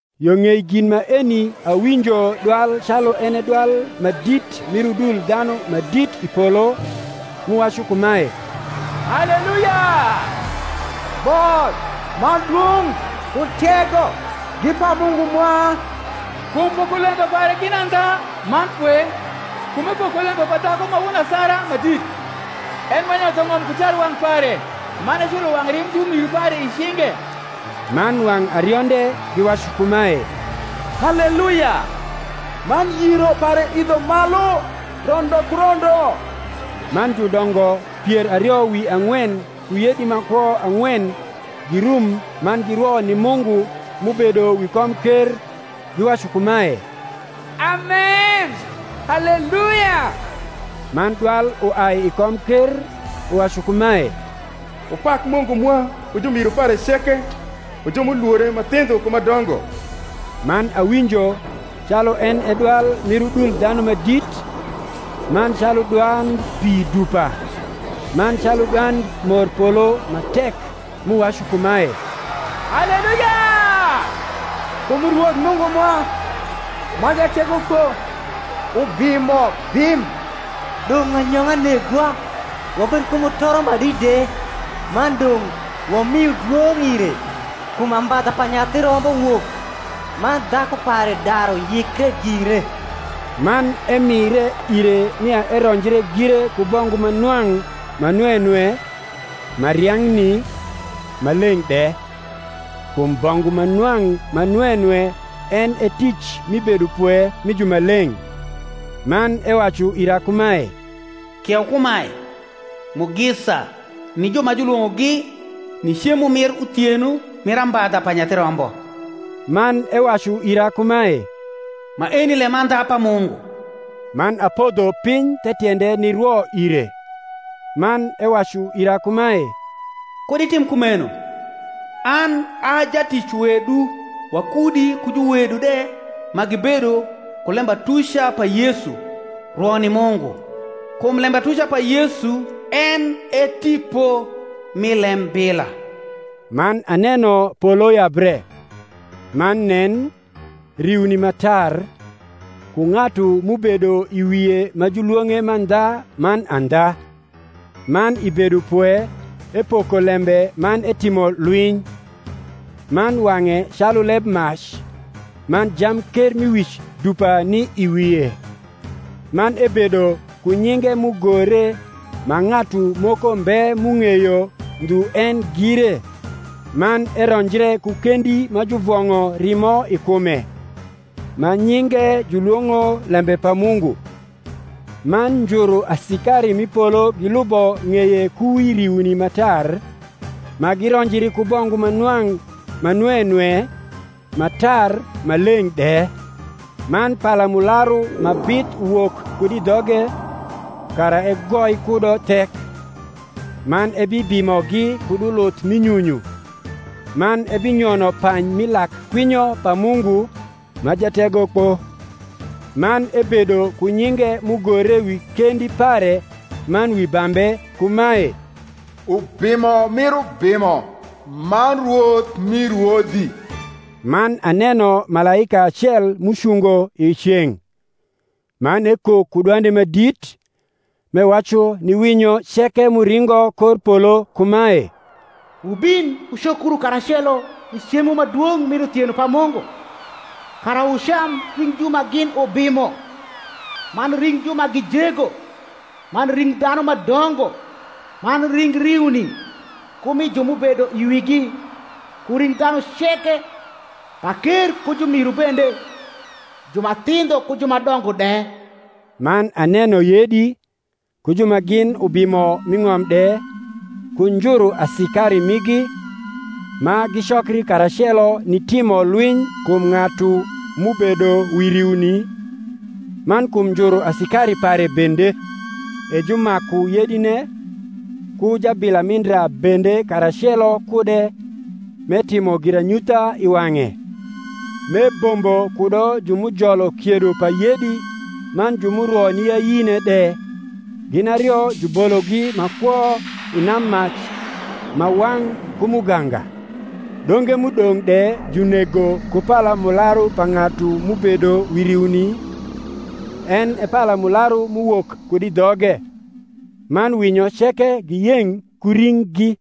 Yo ng’ei gin maeni awinjo dwal calu en e dwal ma dit mir udul dhanu ma dit i polo, m’uwacu kumae, Haleluya; Both, man dwong’, ku tego, gi pa Mungu mwa: kum pokolembe pare gin andha man pwe; kum epoko lembe pa dhaku ma won asara ma dit, en m’enyotho ng’om ku tarwang’ pare, man eculo wang’ rimb jumiru pare i cinge. Man wang’ arionde giwacu kumae, Haleluya. Man yiro pare idho malu rondo ku rondo. Man judongo pier ario wi ang’wen ku yedi ma kwo ang’wen girum man girwo ni Mungu m’ubedo wi komker, giwacu kumae, Amen; Haleluya. Man dwal uai i komker, uwacu kumae, Wupak Mungu mwa, wu jumiru pare ceke, wu ju m’ulwore, ma thindho ku ma dongo. Man awinjo calu en e dwal mir udul dhanu ma dit, man calu dwand pi dupa, man calu dwand morpolo ma tek m’uwacu kumae, Haleluya: kum Rwoth Mungu mwa, ma Jategokpo ubimo bim. Dong’ anyong’a negwa wabed ku mutoro ma dit de, man dong’ wamiu dwong’ ire: kum ambadha pa Nyathi Rombo wok, man dhaku pare daru yikre gire. Man emire ire nia eronjre gire ku bongu ma nwang’ ma nwe nwe, ma riang’ni, ma leng’ de: kum bongu ma nwang’ ma nwe nwe en e tic mi bedopwe mi jumaleng’. Man ewacu ira kumae, Kieu kumae, Mugisa ni ju ma julwong’ogi ni cemo mir uthieno mir ambadha pa Nyathi Rombo. Man ewacu ira kumae, Maeni lemandha pa Mungu. Man apodho piny the tiende nirwo ire. Man ewacu ira kumae, Kud itim kumeno: an a jatic wedu wakudi ku juwedu de ma gibedo ku lembatuca pa Yesu: rwo ni Mungu: kum lembatuca pa Yesu en e tipo mi lembila. Man aneno polo yabre; man nen, riuni ma tar, ku ng’atu m’ubedo i wie ma julwong’e Mandha man Andha; man i bedopwe epoko lembe man etimo lwiny. Man wang’e calu lebmac, man jamkermiwic dupa ni i wie; man ebedo ku nyinge m’ugore ma ng’atu moko mbe m’ung’eyo ndhu en gire. Man eronjre ku kendi ma juvong’o rimo i kume; ma nyinge julwong’o Lembe pa Mungu. Man njuru asikari m’i polo gilubo ng’eye ku wi riuni ma tar, ma gironjri ku bongu ma nwang’ ma nwe nwe, ma tar ma leng’ de. Man palamularu ma bith uwok kud i dhoge, kara egoi kudo thek: man ebibimogi kud uluth mi nyunyu: man ebinyono pany mi lak kwinyo pa Mungu, ma Jategokpo. Man ebedo ku nyinge m’ugore wi kendi pare man wi bambe kumae, UBIMO MIR UBIMO, MAN RWOTH MI RWODHI. Man aneno malaika acel m’ucungo i ceng’; man ekok ku dwande ma dit, m’ewacu ni winyo ceke m’uringo kor polo kumae, Wubin wucokru karacelo ni cemo ma dwong’ mir uthieno pa Mungu; kara wucam ring ju ma gin ubimo, man ring ju ma gi jego, man ring dhanu ma dongo, man ring riuni ku mi ju m’ubedo i wigi, ku ring dhanu ceke, paker ku jumiru bende, ju ma thindho ku ju ma dongo de. Man aneno yedi, ku ju ma gin ubimo m’i ng’om de, ku njuru asikari migi, ma gicokri karacelo nitimo lwiny kum ng’atu m’ubedo wi riuni, man kum njuru asikari pare bende. E jumaku yedine, ku jabila mi ndra bende karacelo kude m’etimo giranyutha i wang’e, m’ebombo kudo ju m’ujolo kiedo pa yedi man ju m’urwo ni ayine de: gin ario jubologi ma kwo i nammac ma wang’ ku muganga: donge m’udong’ de junego ku palamularu pa ng’atu m’ubedo wi riuni, en e palamularu m’uwok kud i dhoge: man winyo ceke giyeng’ ku ringgi.